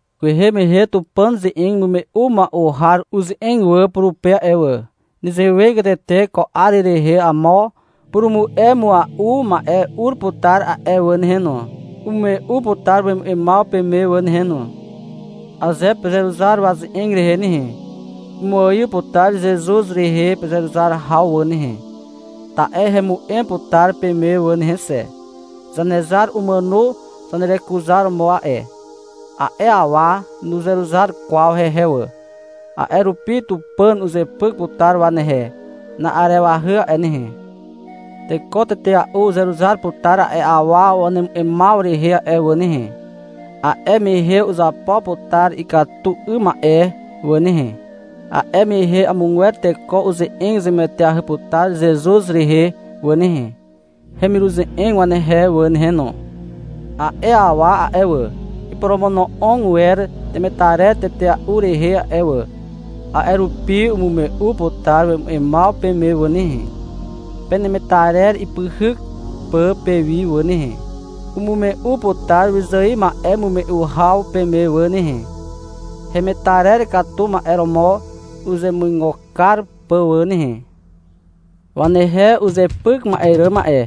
Kwehe mehe Tupàn ze'eg imume'u mua'u har uze'eg wà purupe a'e wà. Nezewegatete ko 'ar rehe amo purumu'e mua'u ma'e ur putar a'e wà nehe no. Umume'u putar wemu'emaw peme wà nehe no. Aze pezeruzar waze'eg rehe nehe, umuaiw putar Zezuz rehe pezeruzar haw wà nehe, ta'e hemu'em putar peme wà nehe xe. Zanezar umàno zanerekuzaromo a'e. A'e awa nuzeruzar kwaw hehe wà. A'e rupi Tupàn uzepyk putar wanehe na'arewahy a'e nehe. Teko tetea'u uzeruzar putar a'e awa wanemu'emaw rehe a'e wà nehe. A'e mehe uzapo putar ikatu 'ym ma'e wà nehe. A'e mehe amogwer teko uze'eg zemueteahy putar Zezuz rehe wà nehe, hemiruze'eg wanehe wà nehe no. A'e awa a'e wà, iporomono'og wer temetarer tetea'u rehe a'e wà, a'e rupi umume'u putar wemu'emaw peme wà nehe, penemetarer ipyhyk pà pewi wà nehe. Umume'u putar wyzài ma'emume'u haw peme wà nehe, hemetarer katu ma'e romo uzemuigo kar pà wà nehe. Wanehe uzepyk ma'e ràm a'e,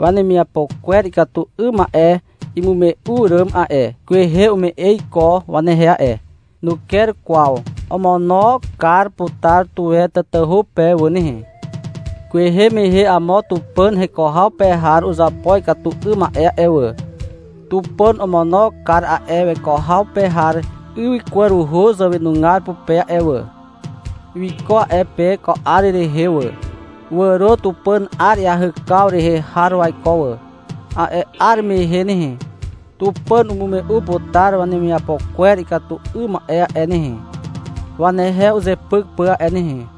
wanemiapo kwer ikatu 'ym ma'e imume'u àràm a'e, kwehe ume'e iko wanehe a'e. Nuker kwaw. Omono kar putar tuwe tatahu pe wà nehe. Kwehe mehe amo Tupàn heko haw pe har uzapo ikatu 'ym ma'e a'e wà. Tupàn omono kar a'e weko haw pe har ywykwaruhu zàwenugar pupe a'e wà. Wiko a'e pe ko 'ar rehe wà. Wàro Tupàn 'ar iahykaw rehe har waiko wà. A'e 'ar mehe nehe, Tupàn umume'u putar wanemiapo kwer ikatu 'ym ma'e a'e nehe, wanehe uzepyk pà a'e nehe.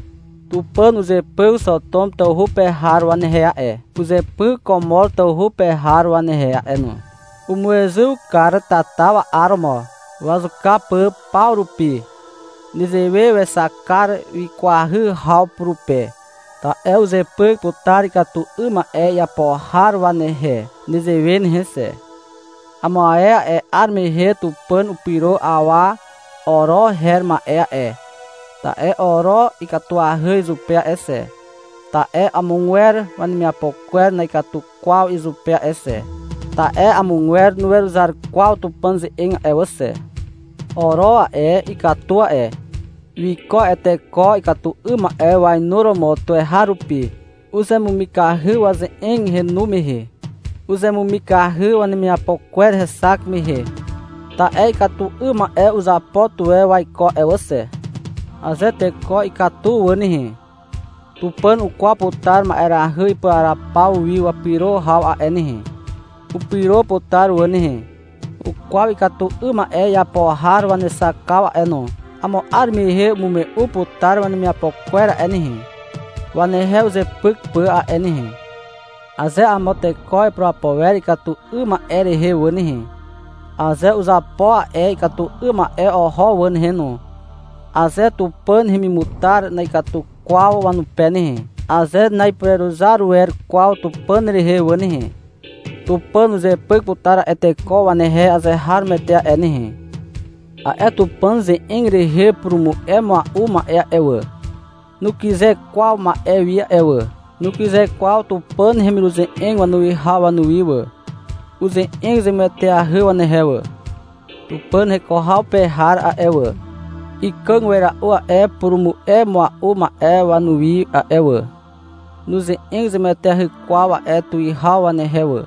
Tupàn uzepyk Xotom tawhu pe har wanehe a'e, uzepyk Komor tawhu pe har wanehe a'e no. Umuezyw kar tata wa'aromo, wazuka pà paw rupi. Nezewe wexak kar wikwahy haw purupe. Ta'e uzepyk putar ikatu 'ym ma'e iapo har wanehe nezewe nehe xe. Amo ae 'ar mehe Tupàn upyro awa Oro her ma'e a'e, ta'e Oro ikatuahy izupe a'e xe, ta'e amogwer wanemiapo kwer na'ikatu kwaw izupe a'e xe. Ta'e amogwer nuweruzar kwaw Tupàn ze'eg a'e wà xe. Oro a'e, ikatu a'e. Wiko a'e teko ikatu 'ym ma'e wainuromo tuweharupi. Uzemumikahy waze'eg henu mehe. Uzemumikahy wanemiapo kwer hexak mehe. Ta'e ikatu 'ym ma'e uzapo tuwe waiko a'e wà xe. Aze teko ikatu wà nehe, Tupàn ukwaw putar ma'erahy ipuraraw paw wi wapyro haw a'e nehe. Upyro putar wà nehe. Ukwaw ikatu 'ym ma'e iapo har wanexakaw a'e no. Amo 'ar mehe umume'u putar wanemiapo kwer a'e nehe, wanehe uzepyk pà a'e nehe. Aze amo teko ipurapo wer ikatu 'ym ma'e rehe wà nehe, aze uzapo a'e ikatu 'ym ma'e oho wà nehe no, aze Tupàn hemimutar na'ikatu kwaw wanupe nehe, aze na'ipureruzar wer kwaw Tupàn rehe wà nehe, Tupàn uzepyk putar a'e teko wanehe azeharomoete a'e nehe. A'e Tupàn ze'eg rehe purumu'e mua'u ma'e a'e wà, nukyze kwaw ma'e wi a'e wà. Nukyze kwaw Tupàn hemiruze'eg wanuwihaw wanuwi wà. Uze'eg zemueteahy wanehe wà. Tupàn heko haw pe har a'e wà, ikàg wera'u a'e purumu'e mua'u ma'e wanuwi a'e wà. Nuze'eg zemueteahy kwaw a'e tuwihaw wanehe wà,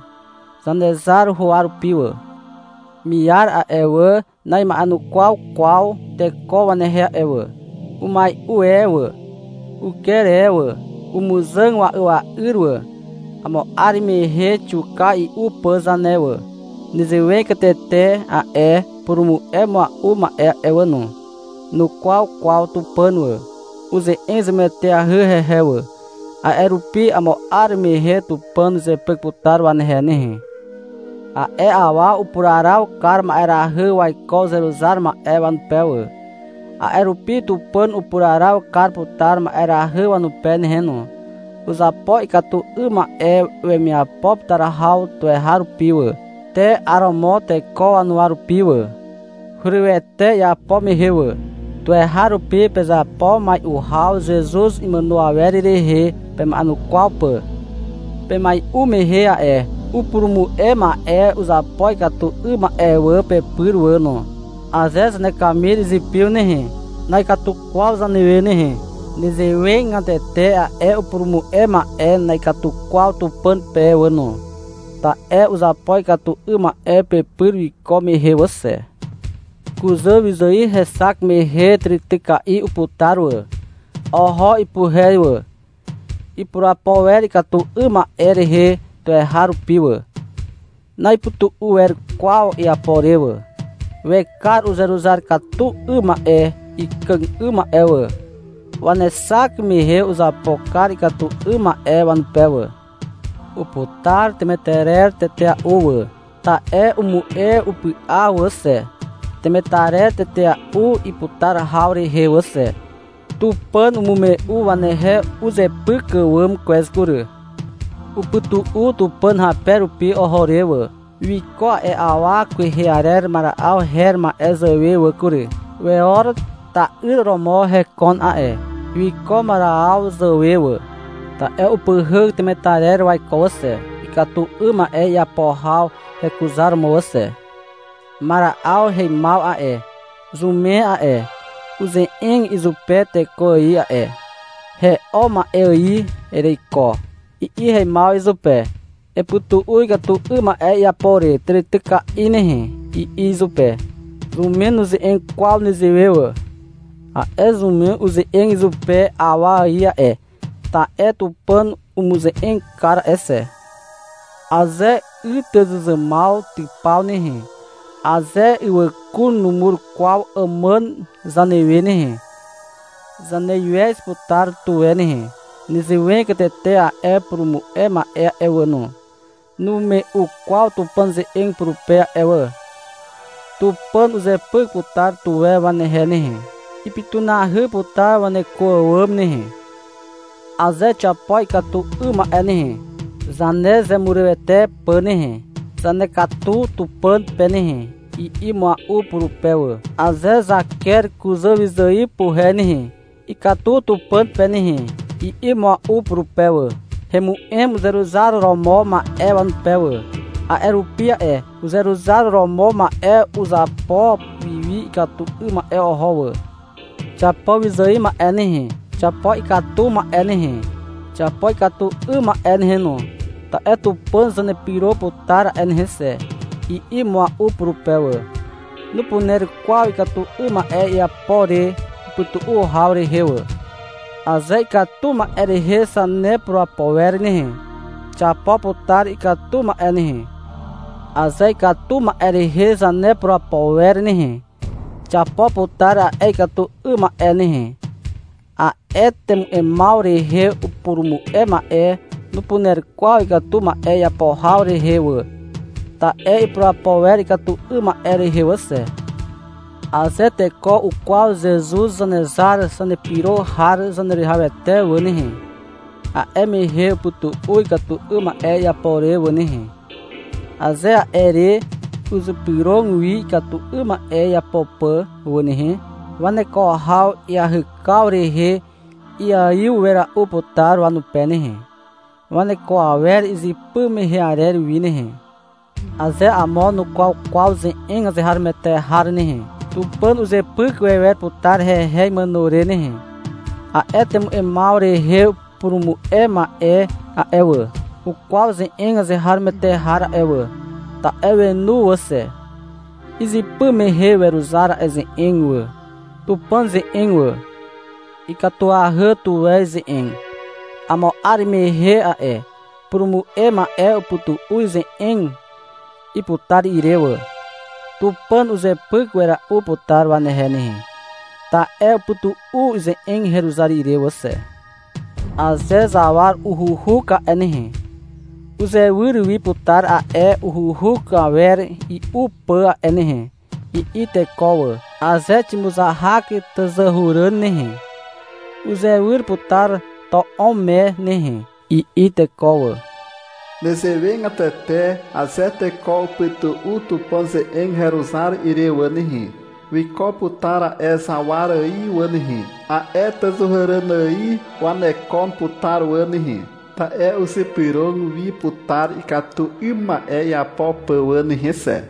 Zanezar huwa rupi wà. Miar a'e wà, na'ima'enukwaw kwaw teko wanehe a'e wà. Umai'u e wà, uker e wà, umuzàg wa'ya'yr wà. Amo 'ar mehe xiuka i'u pà zane wà. Nezewegatete a'e upurumu'e mua'u ma'e a'e wà no. Nukwaw kwaw Tupàn wà. Uze'eg zemueteahy hehe wà. A'e rupi amo 'ar mehe Tupàn uzepyk putar wanehe nehe. A'e awa upuraraw kar ma'erahy waiko uzeruzar ma'e wanupe wà. A'e rupi Tupàn upuraraw kar putar ma'erahy wanupe nehe no. Uzapo ikatu 'ym ma'e wemiapo putar haw tuweharupi wà, te 'aromo teko wanuwa rupi wà. Hurywete iapo mehe wà. Tuweharupi pezapo mai'u haw Zezuz imàno awer rehe pema'enukwaw pà. Pemai'u mehe a'e upurumu'e ma'e uzapo ikatu 'ym ma'e wà pepyr wà no. Aze zanekamir izipiw nehe, na'ikatu kwaw zanewe nehe. Nezewegatete a'e upurumu'e ma'e na'ikatu kwaw Tupàn pe wà no, ta'e uzapo ikatu 'ym ma'e pepyr wiko mehe wà xe. Kuzà wyzài hexak mehe tàrityka'i uputar wà. Oho ipuhe wà. Ipurapo wer ikatu 'ym ma'e rehe tuweharupi wà. Na'ipytu'u wer kwaw iapo re wà. Wekar uzeruzar katu 'ym ma'e ikàg 'ym ma'e wà. Wanexak mehe uzapo kar ikatu 'ym ma'e wanupe wà. Uputar temetarer tetea'u wà. Ta'e umu'e upy'a wà xe, temetarer tetea'u iputar haw rehe wà xe. Tupàn umume'u wanehe uzepyk àwàm kwez kury. Upytu'u Tupàn hape rupi oho re wà. Wiko a'e awa kwehe arer Mara'aw her ma'e zàwe wà kury. Weor ta'yr romo hekon a'e. Wiko Mara'aw zàwe wà, ta'e upyhyk temetarer waiko wà xe, ikatu 'ym ma'e iapo haw hekuzaromo wà xe. Mara'aw heimaw a'e, zumen a'e, uze'eg izupe teko ài a'e. — He'o ma'e ài ereiko, i'i heimaw izupe. — Epytu'u ikatu 'ym ma'e iapo re tàrityka'i nehe, i'i izupe. Zumen nuze'eg kwaw zanewe wà. A'e zumen uze'eg izupe awa ài a'e, ta'e Tupàn umuze'eg kar a'e xe. Aze ytyzuzàmaw typaw nehe, aze ywàkun numur kwaw àmàn zanewe nehe, zaneiwez putar tuwe nehe. Nezewegatete a'e purumu'e ma'e a'e wà no. Numume'u kwaw Tupàn ze'eg purupe a'e wà. Tupàn uzepyk putar tuwe wanehe nehe. Ipytunahy putar waneko àwàm nehe. — Aze xiapo ikatu 'ym ma'e nehe, zanezemurywete pà nehe, zanekatu Tupàn pe nehe, i'i mua'u purupe wà. — Aze zaker kuzàwyzài wapuhe nehe, ikatu Tupàn pe nehe, i'i mua'u purupe wà. Hemu'em uzeruzar romo ma'e wanupe wà. A'e rupi a'e uzeruzar romo ma'e uzapo wiwi ikatu 'ym ma'e oho wà. — Xiapo wyzài ma'e nehe. Xiapo ikatu ma'e nehe, xiapo ikatu 'ym ma'e nehe no, ta'e Tupàn zanepyro putar a'e nehe xe, i'i mua'u purupe wà. Nupuner kwaw ikatu 'ym ma'e iapo re upytu'u haw rehe wà. Aze ikatu ma'e rehe zanepurapo wer nehe, xiapo putar ikatu ma'e nehe. Aze ikatu 'ym ma'e rehe zanepurapo wer nehe, xiapo putar a'e ikatu 'ym ma'e nehe. A'e temu'emaw rehe upurumu'e ma'e nupuner kwaw ikatu ma'e iapo haw rehe wà, ta'e ipurapo wer ikatu 'ym ma'e rehe wà xe. Aze teko ukwaw Zezuz Zanezar Zanepyro har Zaneruwihawete wà nehe, a'e mehe upytu'u ikatu 'ym ma'e iapo re wà nehe. Aze a'e re uzypyrog wi ikatu 'ym ma'e iapo pà wà nehe, waneko haw iahykaw rehe iaiw wera'u putar wanupe nehe, waneko awer izypy mehe arer wi nehe. Aze amo nukwaw kwaw ze'eg azeharomoete har nehe, Tupàn uzepyk wewer putar hehe imàno re nehe. A'e temu'emaw rehe purumu'e ma'e a'e wà, ukwaw ze'eg azeharomoete har a'e wà. Ta'e wenu wà xe. Izypy mehe weruzar a'e ze'eg wà, Tupàn ze'eg wà. Ikatuahy tuwe ize'eg. Amo 'ar mehe a'e purumu'e ma'e upytu'u ize'eg iputar ire wà. Tupàn uzepyk wera'u putar wanehe nehe, ta'e upytu'u ize'eg heruzar ire wà xe. — Aze zawar uhuuhuk a'e nehe, uzewyr wi putar a'e uhuuhuk awer i'u pà a'e nehe, i'i teko wà. Aze ximuzahak tàzàhuràn nehe, uzewyr putar to'om me nehe, i'i teko wà. Nezewegatete aze teko upytu'u Tupàn ze'eg heruzar ire wà nehe, wiko putar a'e zawar ài wà nehe, a'e tàzàhuràn ài wanekon putar wà nehe. Ta'e uzypyrog wi putar ikatu 'ym ma'e iapo pà wà nehe xe.